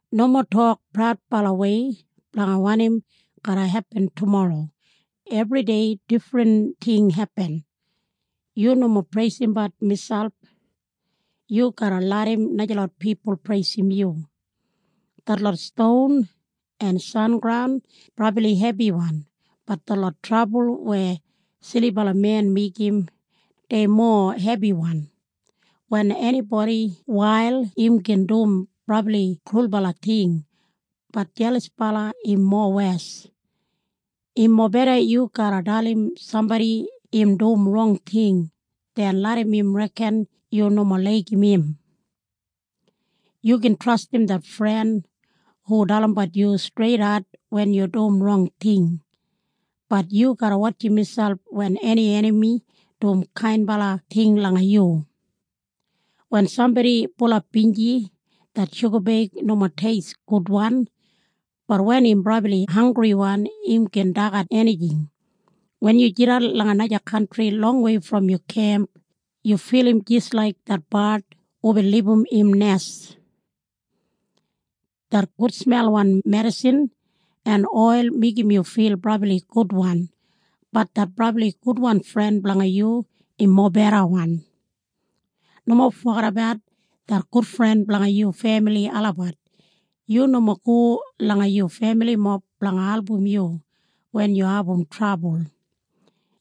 Nomo tok praudbalawei blanga wanim garra hepin tumorro. Ebridei difrin ting hepin. Yu nomo preisimbat miselp. Yu garra larram najalot pipul preisim yu. Detlot ston en sengraun brabli hebiwan, bat detlot trabul weya silibala men meigim, dei mowa hebiwan. Wen enibodi wail im gin dum brabli krulbala ting, bat jelasbala im mowes. Im mobeda yu garra dalim sambodi im dum rong ting den larram im reken yu nomo laigim im. Yu gin trastim det fren hu dalimbat yu streidat wen yu dum rong ting, bat yu garra wotjim miselp wen eni enami dum kainbala ting langa yu. Wen sambodi bulap binji det shugabeig nomo teist gudwan, bat wen im brabli hanggriwan im gin dagat enijing. Wen yu jidan langa naja kantri longwei brom yu kemp, yu filim jis laik det bard hubin libum im nes. Det gudsmelwan medisin en oil meigim yu fil brabli gudwan, bat det brabli gudwan fren blanga yu im mobedawan. Nomo fogedabat det gudfren blanga yu femili olabat. Yu nomo go langa yu femilimob blanga album yu wen yu abum trabul.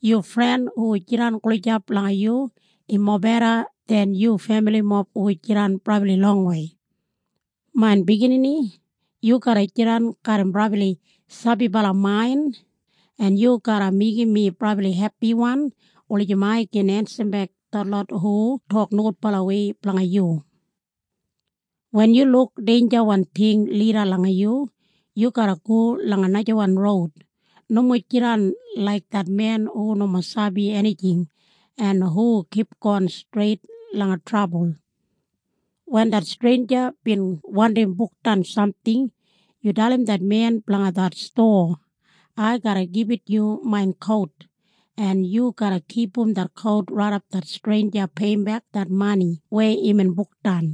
Yu fren hu jidan gulijap langa yu im mobeda den yu femilimob hu jidan brabli longwei. Main biginini, yu garra jidan garram brabli sabibala main en yu garra meigim mi brabli hepiwan wulijim ai gin ensimbek detlot hu tok nogudbalawei blanga yu. Wen yu luk deinjawan ting lida langa yu, yu garra go langa najawan roud. Nomo jidan laik det men hu nomo sabi enijing en hu kipgon streit langa trabul. Wen det streinja bin wandim bukdan samting, yu dalim det men blanga det stowa, “Ai garra gibit yu main kout en yu garra kipum det kout raidap det streinja peiyimbek det mani weya imbin bukdan.”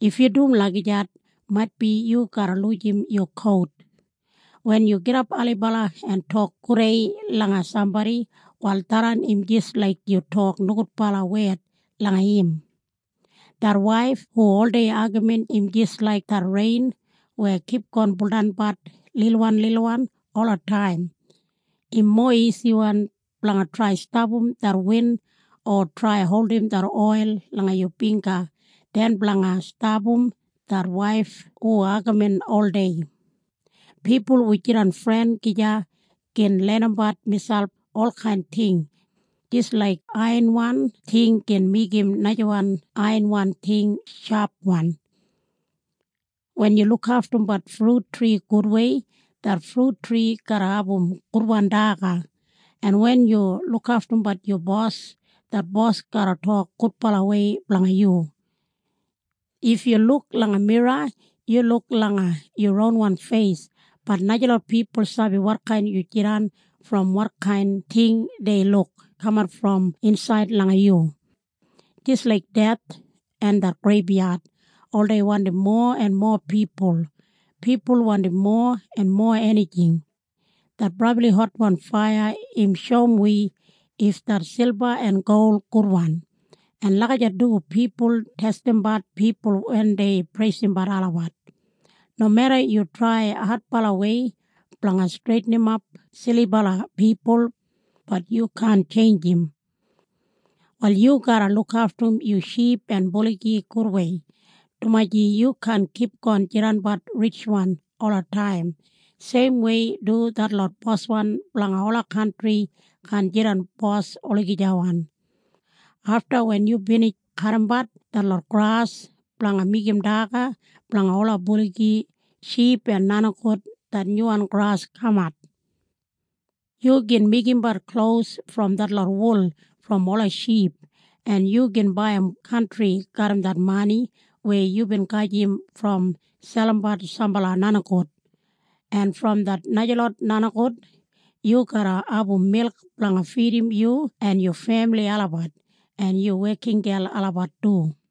If yu dum lagijat maitbi yu garra lujim yu kout! Wen yu gidap ailibala en tok gudei langa sambodi, wal tharran im jis laik yu tok nogudbala wed langa im. Det waif hu oldei agamin im jis laik det rein weya kipgon buldanbat lilwanlilwan olataim. Im mowa isiwan blanga trai stapam det win o trai holdim det oil langa yu bingga den blanga stapam det waif hu agamin oldei. Pipul hu jidan fren gija gin lenimbat miselp olkain ting, jis laik aiyanwan ting gin meigim najawan aiyanwan ting shapwan. Wen yu lukaftumbat frut tri gudwei, det frut tri garra abum gudwan daga, en wen yu lukaftumbat yu bos, det bos garra tok gudbalawei blanga yu. If yu luk langa mira yu luk langa yu ronwan feis, bat najalot pipul sabi wotkain yu jidan brom wotkain ting dei luk kamat brom insaid langa yu. Jis laik deth en det greibyad oldei wandim mowa en mowa pipul, pipul wandim mowa en mowa enijing. Det brabli hotwan faiya im shoum wi if det silba en gol gudwan, en lagijat du pipul testimbat pipul wen dei preisimbat olabat. Nomeda yu trai adbalawei blanga streitinimap silibala pipul, bat yu kaan tjeinjim. Wal yu garra lukaftum yu ship en buligi gudwei, dumaji yu kaan kipgon jidanabat ritjwan olataim. Seimwei du detlot boswan blanga ola kantri kaan jidan bos olagijawan. Afta wen yu binij kadimbat detlot gras blanga meigim daga blanga ola buligi, ship en nenigout, det nyuwan gras kamat. Yu gin meigimbat klos brom detlot wul brom ola ship, en yu gin baiyim kantri garram det mani weya yubin gajim brom selimbat sambala nenigout. En brom det najalot nenigout yu garra abum milk blanga fidim yu en yu femili olabat en yu wekingel olabat du.